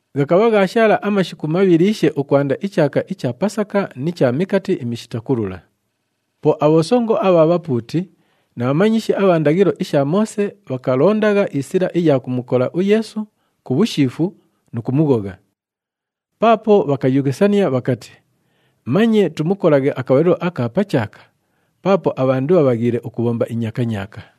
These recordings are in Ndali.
Ghakabha ghaashaala amashiku mabhiliishe ukwanda ichaaka icha Pasaka ni cha Mikati iMishita Kulula. Po abhosongo abha bhapuuti na bhamanyishi abha ndaghilo isha Moose, bhakalondagha isila iya kumukola uYeesu ku bhushiifu nu kumughogha. Paapo bhakayughisania bhakati, “Manye tumukolaghe akabhalilo aka pa chaaka paapo abhandu bhabhaghiile ukubhomba inyakanyaaka.”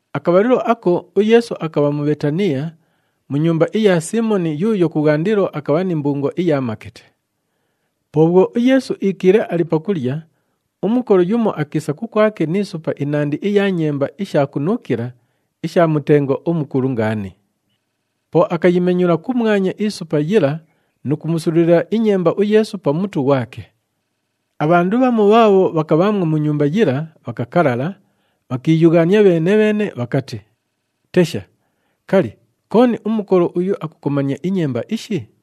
Akabhalilo ako uYeesu akabha mu Bheetaniya mu nyumba iya Siimoni yuuyo kubhwandilo akabha ni mbungo iya makete. Po bhwo uYeesu iikiile ali pakulya, umukolo yumo akiisa kukwake ni supa inandi iya nyemba isha kunuukila isha mutengo umukulu ngaani. Po akayimenyula kumwanya isupa yila nu kumusululila inyemba uYeesu pa mutu ghwake. Abhandu bhamu bhaabho bhakabhaamwo mu nyumba yila bhakakalala, bhakiiyughaania bheene-bheene bhakati, “Tesha! Kali, kooni umukolo uyu akukomania inyemba ishi?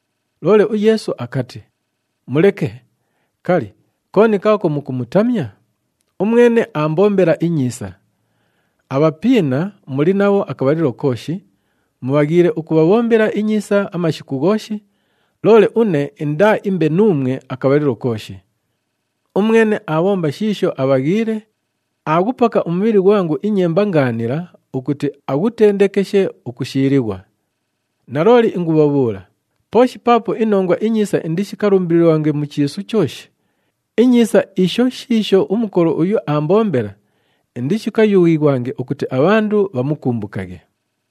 Loole uYeesu akati, “Muleke, kali, kooni kaako mukumutamya? Umwene aambombela inyiisa. Abhapiina muli nabho akabhalilo kooshi, mubhaghiile ukubhabhombela inyiisa amashiku ghooshi, loole une indaaimbe nuumwe akabhalilo kooshi. Umwene aabhomba shiisho abhaghiile, aaghupaka umubhili ghwangu inyemba ingaanila ukuti aghutendekeshe ukushiilighwa. Nalooli ingubhabhuula, pooshi paapo iNongwa iNyiisa indishikalumbililighwange mu chiisu chooshi, inyiisa isho shiisho umukolo uyu aambombela, indishikayughighwange ukuti abhandu bhamukumbukaghe.”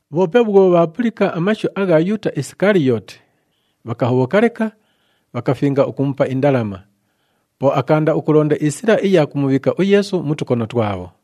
Bhoope bhwo bhaapulika amashu agha Yuuta Isikaliyooti, bhakahobhoka leka, bhakafinga ukumupa indalama. Po akaanda ukulonda isila iya kumubhiika uYeesu mu tukono twabho.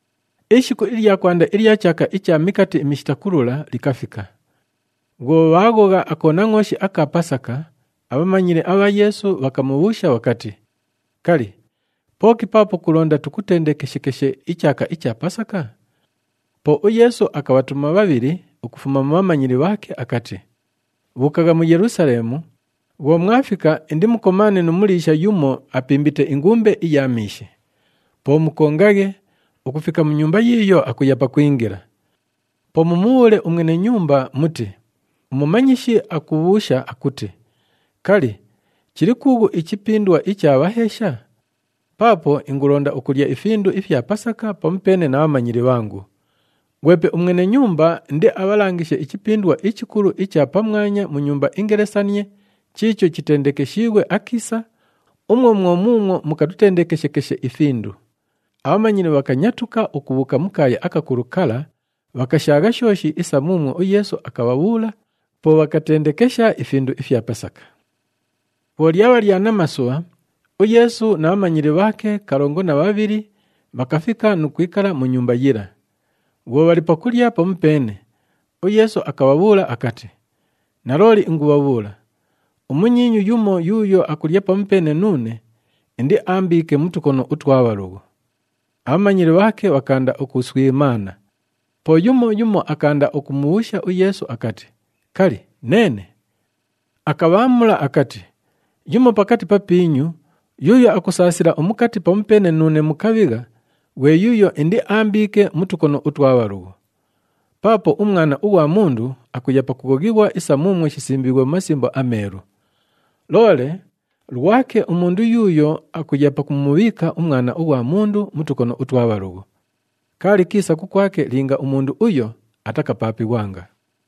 Ishiku ilya kwanda ilya chaaka icha Mikati iMishita Kulula, likafika. Bhwo bhaaghogha akonangʼooshi aka Pasaka, abhamanyili abha Yeesu bhakamubhuusha bhakati, “Kali, pooki paapo kulonda tukutendekeshekeshe ichaaka icha Pasaka?” Po uYeesu akabhatuma bhabhili ukufuma mu bhamanyili bhaake akati, “Bhuukagha mu Yelusaleemu, bhwo mwafika, indimukomaane nu muliisha yumo apimbite ingumbe iya miishi. Po mukongaghe, ukufika mu nyumba yiiyo akuya pakwingila. Po mumubhuule umwene nyumba muti, ‘UMumanyishi akubhuusha akuti, kali, chili kuughu ichipindwa icha bhaheesha? Paapo ingulonda ukulya ifindu ifya Pasaka pamupeene na bhamanyili bhangu.’ Ghwepe umwene nyumba indiabhalangishe ichipindwa ichikulu icha pamwanya mu nyumba ingelesanie chiicho chitendekeshiighwe akiisa, umwo mwo muumwo mukatutendekeshekeshe ifindu.” Abhamanyili bhakanyatuka ukubhuuka mu kaaya akakulu kala, bhakashaagha shooshi isa muumwo uYeesu akabhabhuula, po bhakatendekesha ifindu ifya Pasaka. Bhwo lyabha lya namasubha, uYeesu na bhamanyili bhaake kalongo na bhabhili bhakafika nu kwikala mu nyumba yila. Bhwo bhali pakulya pamupeene, uYeesu akabhabhuula akati, “Nalooli ingubhabhuula, umunyiinyu yumo yuuyo akulya pamupeene nuune, indiaambiike mu tukono utwa bhalughu.” Abhamanyili bhaake bhakaanda ukuswimaana, po yumo yumo akaanda ukumubhuusha uYeesu akati, “Kali, neene?” Akabhaamula akati, “Yumo pakati papiinyu, yuuyo akusaasila umukati pamupeene nuune mu kabhigha, ghwe yuuyo indiaambiike mu tukono utwa bhalughu. Paapo uMwana ughwa Mundu akuya pakughoghighwa isa muumwo shisimbiighwe mu Masimbo aMeelu. Loole lwake umundu yuuyo akuya pakumubhiika uMwana ughwa Mundu mu tukono utwa bhalughu. Kaali kiisa kukwake linga umundu uyo atakapaapighwanga.”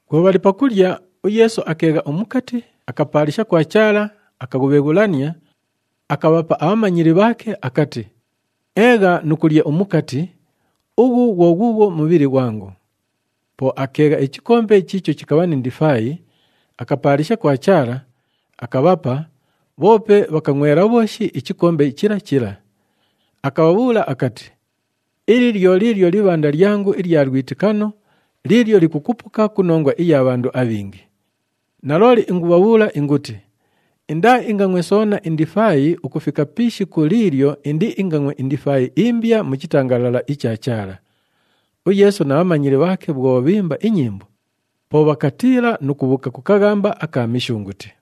Bhwo bhali pakulya, uYeesu akeegha umukati, akapaalisha kwa Chaala, akaghubheghulania, akabhapa abhamanyili bhaake akati, “Eegha nu kulya umukati, ughu ghwo ghuughwo mubhili ghwangu.” Po akeegha ichikombe chiicho chikabha ni ndifaayi, akapaalisha kwa Chaala, akabhapa, bhoope bhakangʼwela bhooshi ichikombe chila chila. Akabhabhuula akati, “Ili lyo liilyo libhanda lyangu ilya lwitikano liilyo likukupuka ku nongwa iya bhandu abhingi. Nalooli ingubhabhuula inguti, indaaingangʼwe soona indifaayi ukufika pi ishiku liilyo indiingangʼwe indifaayi imbya mu chitangalala icha Chaala.” UYeesu na bhamanyili bhaake bhwo bhiimba inyimbo, po bhakatiila nu kubhuuka ku kaghamba aka Mishunguti.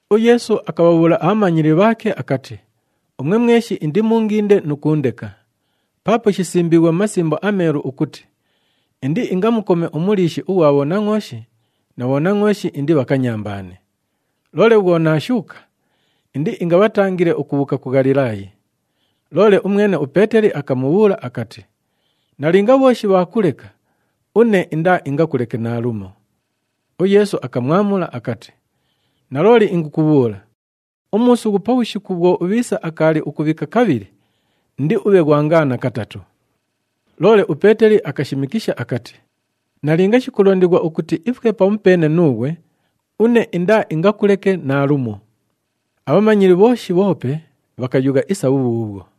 UYeesu akabhabhuula abhamanyili bhaake akati, “Umwe mweshi indimuunginde nu kuundeka. Paapo shisimbiighwe mu Masimbo aMeelu ukuti, ‘Indiingamukome umuliishi ughwa bhonangʼooshi, na bhonangʼooshi indibhakanyambaane.’ Loole bhwo naashuuka, indiingabhatangile ukubhuuka ku Ghalilaayi.” Loole umwene uPeeteli akamubhuula akati, “Nalinga bhooshi bhaakuleka, une indaaingakuleke naalumo.” UYeesu akamwamula akati, “Nalooli ingukubhuula, umuusughu pabhushiku bhwo ubhiisa akaali ukubhika kabhili, indiubhe ghwangaana katatu.” Loole uPeeteli akashimikisha akati, “Nalinga shikulondighwa ukuti ifwe pamupeene nuughwe, une indaaingakuleke naalumo.” Abhamanyili bhooshi bhoope bhakayugha isa bhubhuubhwo.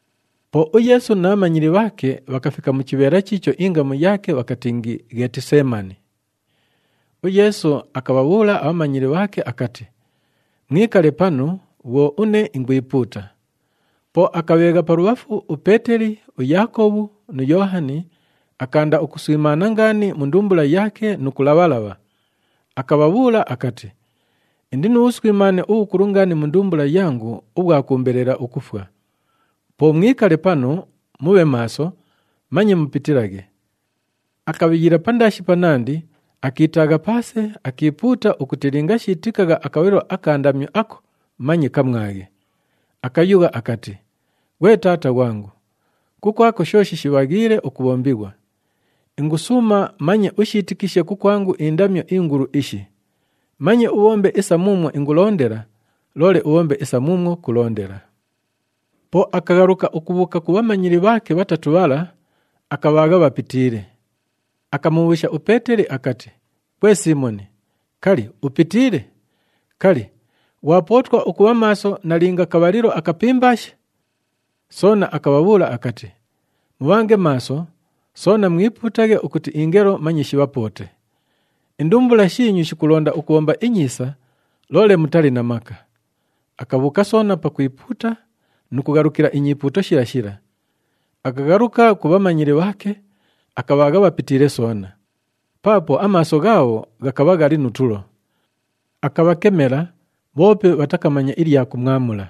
Po uYeesu na bhamanyili bhaake bhakafika mu chibheela chiicho ingamu yaake bhakatingi, Ghetiseemani. UYeesu akabhabhuula abhamanyili bhaake akati, “Mwikale panu bhwo une ingwipuuta.” Po akabheegha palubhafu uPeeteli, uYaakobhu nu Yoohani, akaanda ukuswimaana ngaani mu ndumbula yaake nu kulabha-labha. Akabhabhuula akati, “Indi nu bhuswimaane ubhukulu ngaani mu ndumbula yangu ubhwa kuumbelela ukufwa. Po mwikale panu, mubhe maaso, manye mupitilaghe.” Akabhiyila pandaashi panandi, akiitaagha paase, akiipuuta ukuti linga shiitikagha akabhalilo aka ndamyo ako manye kamwaghe. Akayugha akati, “Ghwe Taata ghwangu, kukwako shooshi shibhaghiile ukubhombighwa, ingusuuma manye ushiitikishe kukwangu indamyo ingulu ishi! Manye ubhombe isa muumwo ingulondela, loole ubhombe isa muumwo kulondela.” Po akaghaluka ukubhuuka ku bhamanyili bhaake bhatatu bhala, akabhaagha bhapitiile. Akamubhuusha uPeeteli akati, “Ghwe Siimoni, kali, upitiile? Kali, ghwapootwa ukubha maaso nalinga kabhalilo akapimbaashe?” Soona akabhabhuula akati, “Mubhange maaso, soona mwipuutaghe ukuti ingelo manye shibhapoote. Indumbula shiinyu shikulonda ukubhomba inyiisa, loole mutali na maka.” Akabhuuka soona pakwipuuta nu kughalukila inyipuuto shila shila. Akaghaluka ku bhamanyili bhaake, akabhaagha bhapitiile soona, paapo amaaso ghaabho ghakabha ghali nu tulo. Akabhakemela, bhoope bhatakamanya ilya kumwamula.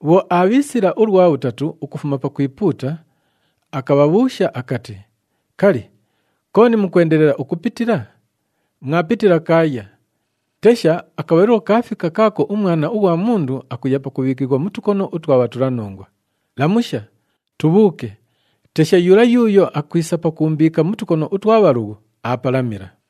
Bhwo aabhiisila ulwa bhutatu ukufuma pakwipuuta, akabhabhuusha akati, “Kali, kooni mukwendelela ukupitila? Mwapitila kaaya! Tesha, akabhalilo kaafika kaako uMwana ughwa Mundu akuya pakubhiikighwa mu tukono utwa bhatulanongwa. Lamusha! Tubhuuke. Tesha, yula yuuyo akwisa pakuumbiika mu tukono utwa bhalughu, aapalamila.”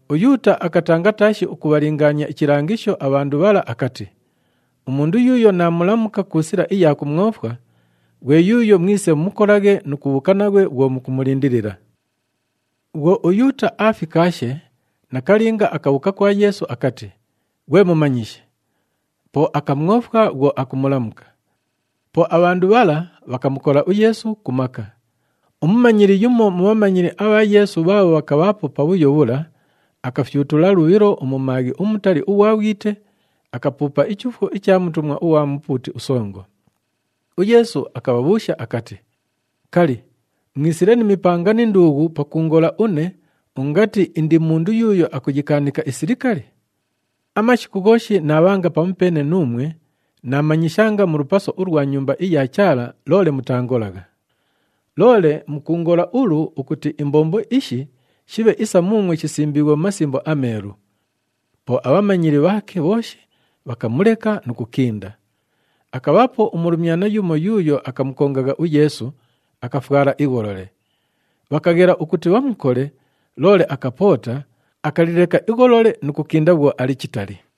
UYuuta akatanga taashi ukubhalingaania ichilangisho abhandu bhala akati, “Umundu yuuyo naamulamuka ku sila iya kumwofwa, ghwe yuuyo mwise mumukolaghe nu kubhuuka naghwe bhwo mukumulindilila.” Bhwo uYuuta aafikaashe, nakalinga, akabhuuka kwa Yeesu akati, “Ghwe Mumanyishi!” Po akamwofwa bhwo akumulamuka. Po abhandu bhala, bhakamukola uYeesu ku maka. Umumanyili yumo mu bhamanyili abha Yeesu bhaabho bhakabhaapo pabhuyo bhula, akafyutula lubhilo umumaaghi umutali ughwa bhwite, akapuupa ichuufwo icha mutumwa ughwa mupuuti usongo. UYeesu akabhabhuusha akati, “Kali, mwisile ni mipanga ni nduughu pakuungola une ungati indi mundu yuuyo akuyikaanika isilikali? Amashiku ghooshi naabhanga pamupeene nuumwe, naamanyishanga mu lupaso ulwa Nyumba iya Chaala loole mutaangolagha. Loole mukuungola ulu ukuti imbombo ishi shibhe isa muumwo shisimbiighwe mu Masimbo aMeelu.” Po abhamanyili bhaake bhooshi bhakamuleka nu kukinda. Akabhaapo umulumyana yumo yuuyo akamukongagha uYeesu, akafwala igholole. Bhakaghela ukuti bhamukole loole akapoota, akalileka igholole nu kukinda bhwo ali chitali.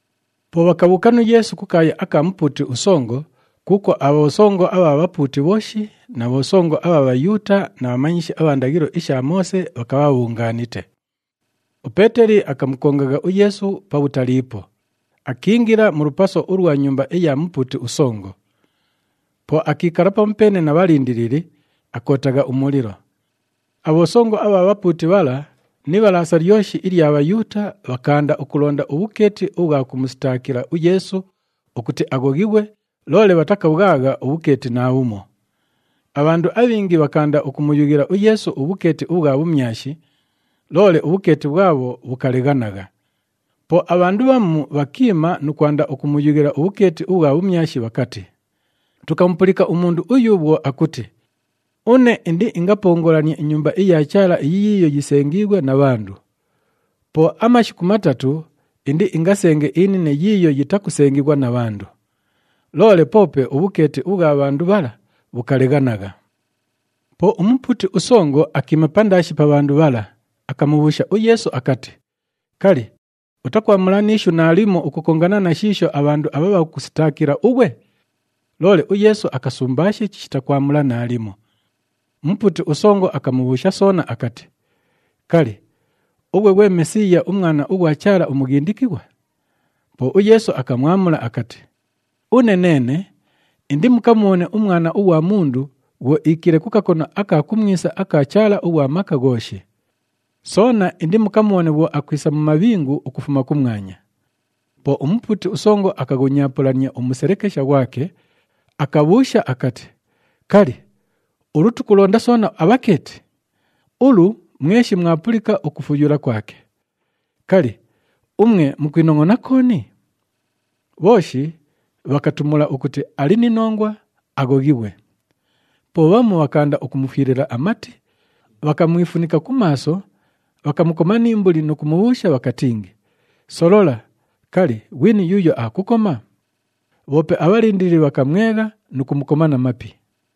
Po bhakabhuuka nu Yeesu kukaaya aka mupuuti usongo kuukwo abhosongo abha bhapuuti bhooshi na bhosongo abha Bhayuuta na bhamanyishi abha ndaghilo isha Moose bhakabha bhabhungaanite. UPeeteli akamukongagha uYeesu pabhutaliipo, akiingila mu lupaso ulwa nyumba iya mupuuti usongo. Po akiikala pamupeene na bhalindilili, akootagha umulilo. Abhosongo abha bhapuuti bhala ni Ibhalaasa lyoshi ilya Bhayuuta, bhakaanda ukulonda ubhukeeti ubhwa kumusitaakila uYeesu ukuti aghoghighwe, loole bhatakabhwagha ubhukeeti naabhumo. Abhandu abhingi bhakaanda ukumuyughila uYeesu ubhukeeti ubhwa bhumyashi, loole ubhukeeti bhwabho bhukaleghanagha. Po abhandu bhamu bhakiima nu kwanda ukumuyughila ubhukeeti ubhwa bhumyashi bhakati, “Tukamupulika umundu uyu bhwo akuti, ‘Une indiingapongolanie iNyumba iya Chaala iyi yiiyo yisengiighwe na bhandu. Po ku mashiku matatu, indiingasenge inine yiiyo yitakusengighwa na bhandu.’” Loole poope ubhukeeti ubhwa bhandu bhala bhukaleghanagha. Po umupuuti usongo akiima pandaashi pa bhandu bhala, akamubhuusha uYeesu akati, “Kali, utakwamula ni ishu naalimo ukukongana na shiisho abhandu abha bhakukusitaakila ughwe?” Loole uYeesu akasumbaashe chishita kwamula naalimo. Umupuuti usongo akamubhuusha soona akati, “Kali, ughwe ghwe Mesiiya, uMwana ughwa Chaala uMughindikighwa?” Po uYeesu akamwamula akati, “Une neene, indimukamubhone uMwana ughwa Mundu bhwo iikiile ku kakono aka kumwisa aka Chaala ughwa Maka Ghooshi. Soona indimukamubhone bhwo akwisa mu mabhingu ukufuma kumwanya.” Po umupuuti usongo akaghunyaapulania umuselekesha ghwake, akabhuusha akati, “Kali, ulu tukulonda soona abhakeeti? Ulu, mweshi mwapulika ukufuyula kwake! Kali, umwe mukwinongʼona kooni?” Bhooshi bhakatumula ukuti ali ni nongwa, aghoghighwe. Po bhamu bhakaanda ukumufwilila amati, bhakamwifunika ku maaso, bhakamukoma ni mbuli nu kumubhuusha bhakatingi, “Solola, kali, ghwini yuuyo aakukoma?” Bhoope abhalindilili bhakamwegha nu kumukoma na mapi.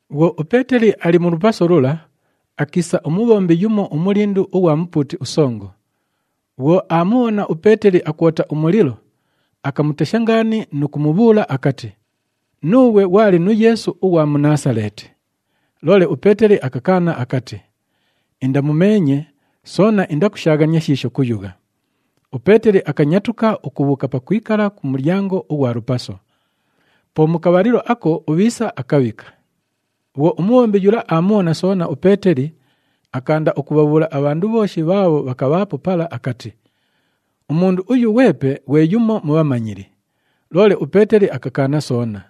Bhwo uPeeteli ali mu lupaso lula, akiisa umubhombi yumo umulindu ughwa mupuuti usongo. Bhwo aamubhona uPeeteli akwota umulilo, akamutesha ngaani nu kumubhuula akati, “Nuughwe ghwali nu Yeesu ughwa mu Naasaleeti.” Loole uPeeteli akakaana akati, “Indamumeenye, soona indakushaaghania shiisho kuyugha.” UPeeteli akanyatuka ukubhuuka pakwikala ku mulyango ughwa lupaso. Po mu kabhalilo ako, ubhiisa akabhika. Bhwo umubhombi yula aamubhona soona uPeeteli, akaanda ukubhabhuula abhandu bhooshi bhaabho bhakabhaapo pala akati, “Umundu uyu ghwepe ghwe yumo mu bhamanyili.” Loole uPeeteli akakaana soona.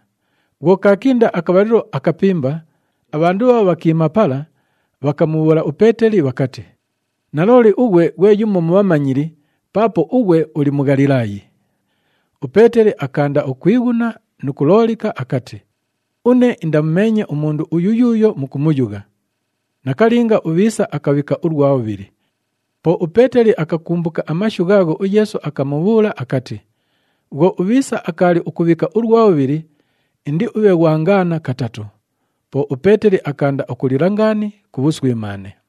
Bhwo kaakinda akabhalilo akapimba, abhandu bhaabho bhakiima pala bhakamubhuula uPeeteli bhakati, “Nalooli ughwe ghwe yumo mu bhamanyili paapo ughwe uli Mughalilaayi.” UPeeteli akaanda ukwighuna nu kuloolika akati, “Une indamumeenye umundu uyu yuuyo mukumuyugha.” Nakalinga, ubhiisa akabhika ulwa bhubhili. Po uPeeteli akakumbuka amashu ghaagho uYeesu akamubhuula akati, “Bhwo ubhiisa akaali ukubhika ulwa bhubhili, indiubhe ghwangaana katatu.” Po uPeeteli akaanda ukulila ngaani ku bhuswimaane.